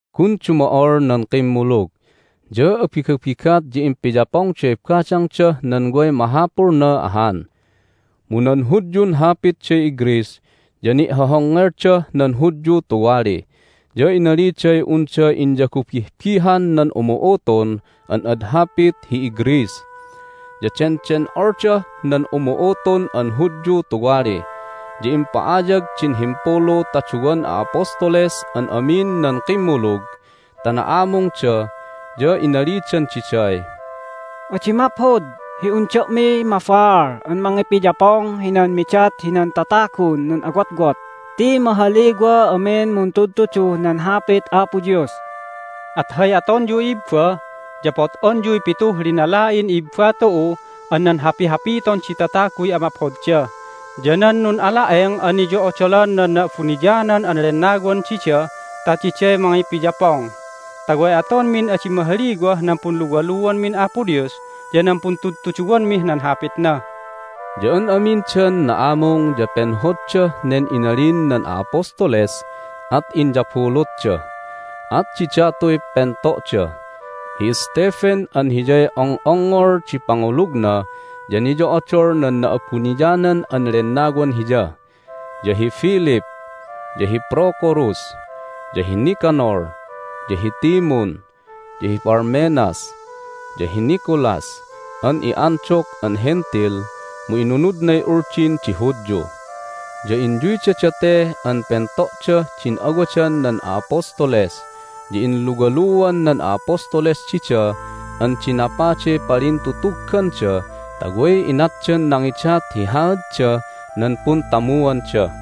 Gun dumo'ol nan kimmulug, ya abigabigat ya impiyapongday badangdah nan way mahapulna ahan. Mu nan Hudyun hapitday iGreece ya ni'hohongngeldah nan Hudyu tuwali, ya inaliday unda inyagubihbihan nan umu'utun an ad hapit hi iGreece, ya denden'oldah nan umu'utun an Hudyu tuwali. Ya impa'ayag din himpulu ta duwan a'apostoles an amin nan kimmulug ta na'amungda, ya inalidan diday, "Adi maphod hi un da'miy mabaal an mangipiyapong hinan midat hinan tatagun nun'awotwot ti mahaliwa amin muntudtuduh nan Hapit Apo Dios. At hay atonyu, i'ibba, ya pot'onyuy pituh linala'in i'ibba tu'u an nan hapihapiton di tataguy amaphodda, ya nan nun'ala'eng an niyo'odolan an nan Na'abuniyanan an Lennawan dida ta diday mangipiyapong ta way atonmin adi mahaliwah nan punluwaluanmin Apo Dios ya nan puntudtuduwanmih nan Hapitna." Ya an amindan na'amung ya penhoddah nen inalin nan a'apostoles, at inyabulutda. At didatuy pento'da: hi Stephen (an hiyay ong'ongngol di pangulugna ya niyo'odol nan Na'abuniyanan an Lennawan hiya), ya hi Philip, ya hi Procorus, ya hi Nicanor, ya hi Timun, ya hi Parmenas, ya hi Nicolas (an i'Antioch an Hentil, mu inunudnay Uldin di Hudyu). Ya inyuyda date nan pento'dah din awadan nan a'apostoles, ya inluwaluan nan a'apostoles dida an dinapaday palintutugganda ta way inatdan nangidat hi haaddah nan puntamuanda.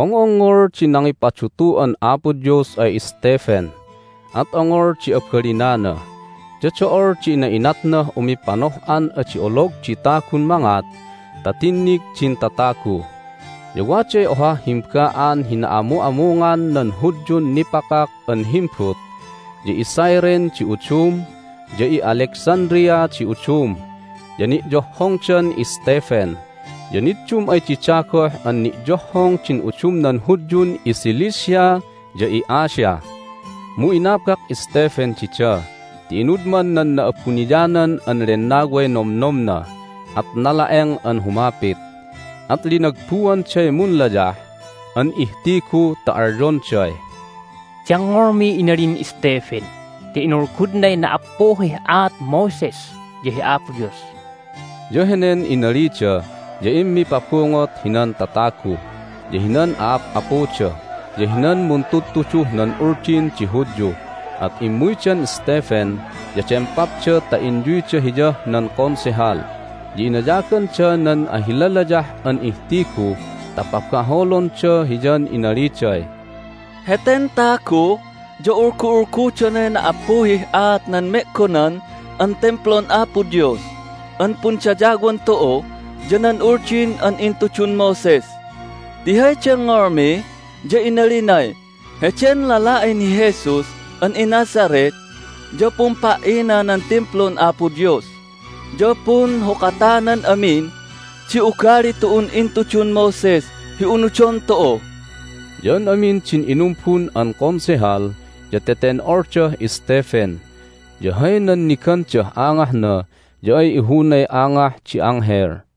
Ong'ongngol di nangipadutu'an Apo Dios ay Stephen, at ongol di abalinana, ya do'ol di ina'inatnah umipanoh'an adi olog di tagun mangat ta tinnig din tatagu. Ya waday ohah himba'an hi na'amu'amungan nan Hudyun nipakak an himbut, ya iCyrene di udum, ya i'Alexandria di udum. Ya ni'yohhongdan Stephen, ya niddum ay dida goh an ni'yohhong din udumnan Hudyun iCilicia ya i'Asia. Mu inabak Stephen dida ti inudman nan Na'abuniyanan an Lennaway nomnomna, at nala'eng an humapit. At linagbuanday munlayah an ihtigu ta alyonday, "Dengngolmiy inalin Stephen ti inulgudnay na"appuhih aat Moses ya hi Apo Dios!" Ya henen inalida ya immipabungot hinan tatagu, ya hinan a'ap'apuda, ya hinan muntudtuduh nan Uldin di Hudyu, at immuydan Stephen, ya dempapda ta inyuyda hiyah nan Konsehal. Ya inayaganda nan ahilalayah an ihtigu ta pabaholonda hiyan inaliday, "Heten tagu ya ulgu'ulgudonay na"appuhih aat nan me'gonan an Timplun Apo Dios an pundayawan tu'u ya nan Uldin an intudun Moses! Ti hay dengngolmi ya inalinay, Heden lala'in hi Jesus an iNazareth ya pumpa"ina nan Timplun Apo Dios, ya punhukatanan amin di ugali tu'un intudun Moses hi unudon tu'u!" Ya an amin din inumbun hinan Konsehal ya teten'oldah Stephen, ya hay nannigandah angahna ya ay ihunay angah di anghel.